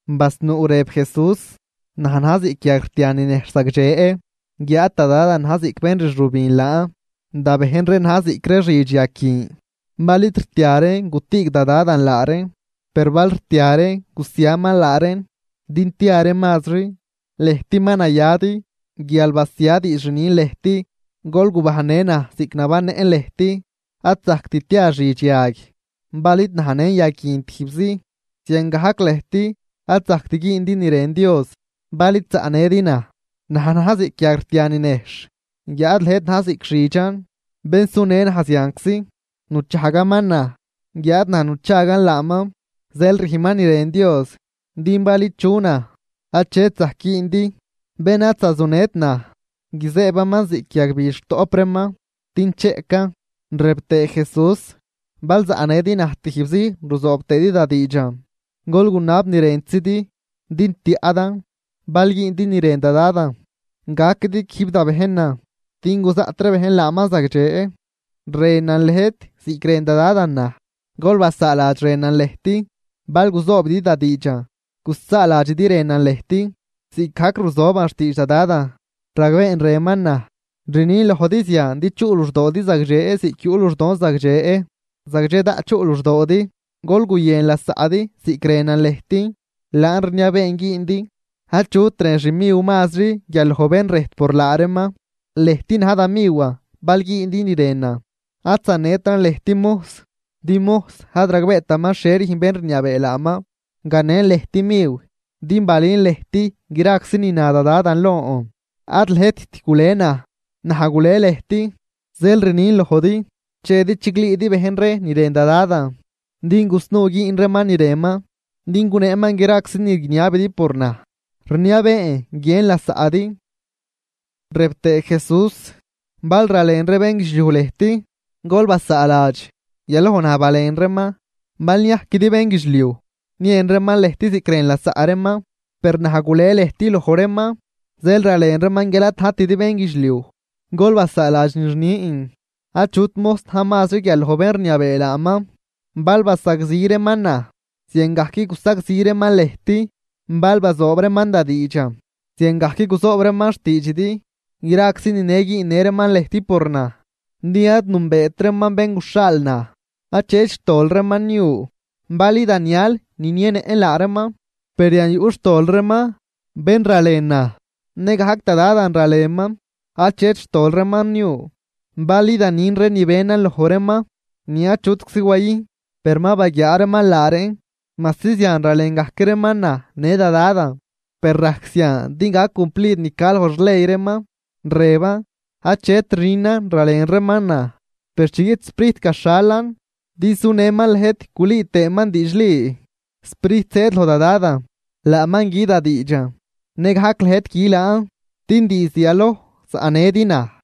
Basnuu rëb Jesús: ―Naj na̱j ziꞌc yag rtia ni nejxh zagdxe, guiáad da Dadan na̱j ziꞌc bén rxübin laan. Da bejn reen na̱j ziꞌc ree xidx yag guin. Bal id rtia reen gutüüg da Dadan laa reen. Per bal rtia reen, gusiaman laa reen din tia reen mazri. Lëjt ma nayadi, guial basia diidx rnin lëjt. Gol gubajnnë naj ziꞌc nabannëꞌn lëjt. Ad zajct tia xidx yag, bal id najnën yag guin tijbzi. Ziangajc lëjt ad zajct güündi ni rën Dios bal id zaꞌnëdi naj. ’Naj na̱j ziꞌc yag rtia ni nejxh, guiáad lëjt na̱j ziꞌc xidxan. Bén sunë naj zianczi nuchajgaman naj, guiáad naj nuchagan laaman, zeel rüjnman ni rën Dios. Din bal ichu naj, achet zajc güündi. Bén ad zazujnët naj guizëëbaman ziꞌc yagbidx rutoꞌp reeman, din cheꞌcan. Rëb tëë Jesús: ―Bal zaꞌnëdi naj tijbzi ruzoob tëëdi da diidxan, gol gunab ni rëntzidi, din tiaꞌdan. Bal güündi ni rën da Dadan, gaquidi quijb da bejnan, din guzaꞌt ree bejn laaman zagdxe. Rënan lëjt ziꞌc rën da Dadan naj, gol basaaladx rënan lëjt. Bal guzoobidi da diidxan, gusaaladxidi rënan lëjt, ziꞌcgajc ruzoban xtiidx da Dadan, ragbeen rënman naj. ’Rnin lojdi zian din chuꞌ luxdoodi zagdxe ziꞌc yuꞌ luxdon zagdxe, zagdxe daꞌt chuꞌ luxdoodi. Gol guyën lasaꞌdi ziꞌc rënan lëjt, laan rniabeen güündi. Achut rën xmiw mazri guial loj bén rëjt por laa reeman. Lëjt na̱j da miwan bal güündi ni rënan. Ad zanetran lëjt mojs, din mojs ad ragbeetaman xhie rüjn bén rniabee laaman. Ganen lëjt miw, din balün lëjt graczi ni na da Dadan lon. Ad lëjtt gule naj, naj gule lëjt. Zeel rnin lojdi, chedi chiglüüdi bejn ree ni rën da Dadan, din gusnuu güün reeman ni rënman, din guneeman graczi ni guiniabidi por naj. Rniabeen: Guiën lasaꞌdi. Rëb tëë Jesús: ―Bal ralen ree bénguidxliuj lëjt, gol basaaladx, yaloj naj balen reeman. Bal niajquidi bénguidxliuj, niën reeman lëjt ziꞌc rën lasaꞌ reeman. Per naj gule lëjt loj reeman, zeel ralen reeman guial ad najtidi bénguidxliuj. Gol basaaladx ni rnin: “Achut mojs na̱j mazri guial loj bén rniabee laaman.” Bal basagzi reeman naj, ziangajc gusagzi reeman lëjt, bal bazoob reeman da diidxan, ziangajc guzoob reeman xtiidxidi. Graczi nine güünnë reeman lëjt por naj, din ad nünbeet reeman bén guxhaal naj. ’Achet xtol reeman niu, bal idan nial ninienëꞌn laa reeman, per yan yuꞌ xtol reeman. Bén ralen naj, nëgajc da Dadan ralenman. Achet xtol reeman niu, bal idan nün ree ni benan loj reeman ni achutczi wayüjn, per ma baguiaa reeman laa reen, majsi zian ralen gajc reeman naj në da Dadan. Per rajc zian din gac cumplid ni ca loj xley reeman, rëban: “Achet rünan ralen reeman naj.” ’Per chi guiꞌt Sprijt gaxhalan din sunëman lëjt gulüü tëëman diidxli, Sprijt zëëd loj da Dadan, laaman gü da diidxan. Nëgajc lëjt gü laan, din diizd yaloj zaꞌnëdi naj.